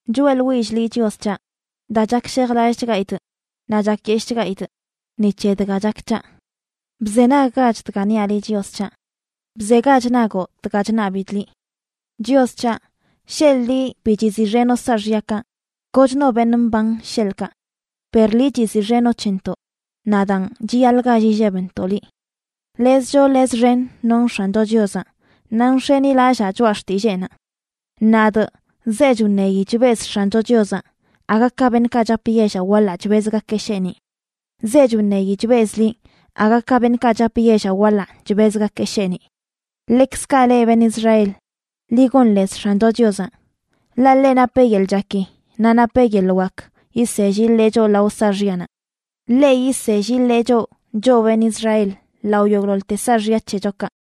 Choeꞌḻwillꞌ liꞌ, Chios c̱haꞌ, daa chakshejlallꞌchgaidꞌ naꞌ chakyeshꞌchgaidꞌ ni c̱he dga chak c̱haꞌ. Bzenaggach dga niaꞌ liꞌ, Chios c̱haꞌ. Bzegach nagoꞌ dga chṉabidꞌ liꞌ. Chios c̱haꞌ, sheḻꞌ liꞌ bi chiziꞌxenoꞌ saaxyakaꞌ, kochno beṉꞌ mban, sheḻꞌkaꞌ. Per liꞌ chiziꞌxenoꞌ c̱hentoꞌ, naꞌ daan chiyaḻꞌ gall illebntoꞌ liꞌ. Lez choo lez xen nonꞌ X̱ancho Chiozaꞌ, naꞌ nx̱enilallaa choꞌa xtilleenaꞌ. Nadꞌ zechꞌ wṉeyi chbezꞌ X̱ancho Chiozaꞌ, aga ka beṉꞌkaꞌ chap yellaꞌ waḻaꞌ chbezgakeꞌ sheeniꞌ. Zechꞌ wṉeyi chbezꞌ liꞌ aga ka beṉꞌkaꞌ chap yellaꞌ waḻaꞌ chbezgakeꞌ sheeniꞌ. Ḻekzkaꞌ leꞌ, beṉꞌ Israel, ḻi gon lez X̱ancho Chiozaꞌ. Ḻaꞌ ḻeꞌ napeꞌ yeḻꞌ chaki, naꞌ napeꞌ yeḻꞌ wak yisell yiḻee choꞌ lao saaxyanaꞌ. Ḻeꞌ yisell yiḻee choꞌ, choꞌ beṉꞌ Israel, lao yogꞌḻoḻte saaxya c̱hechokaꞌ.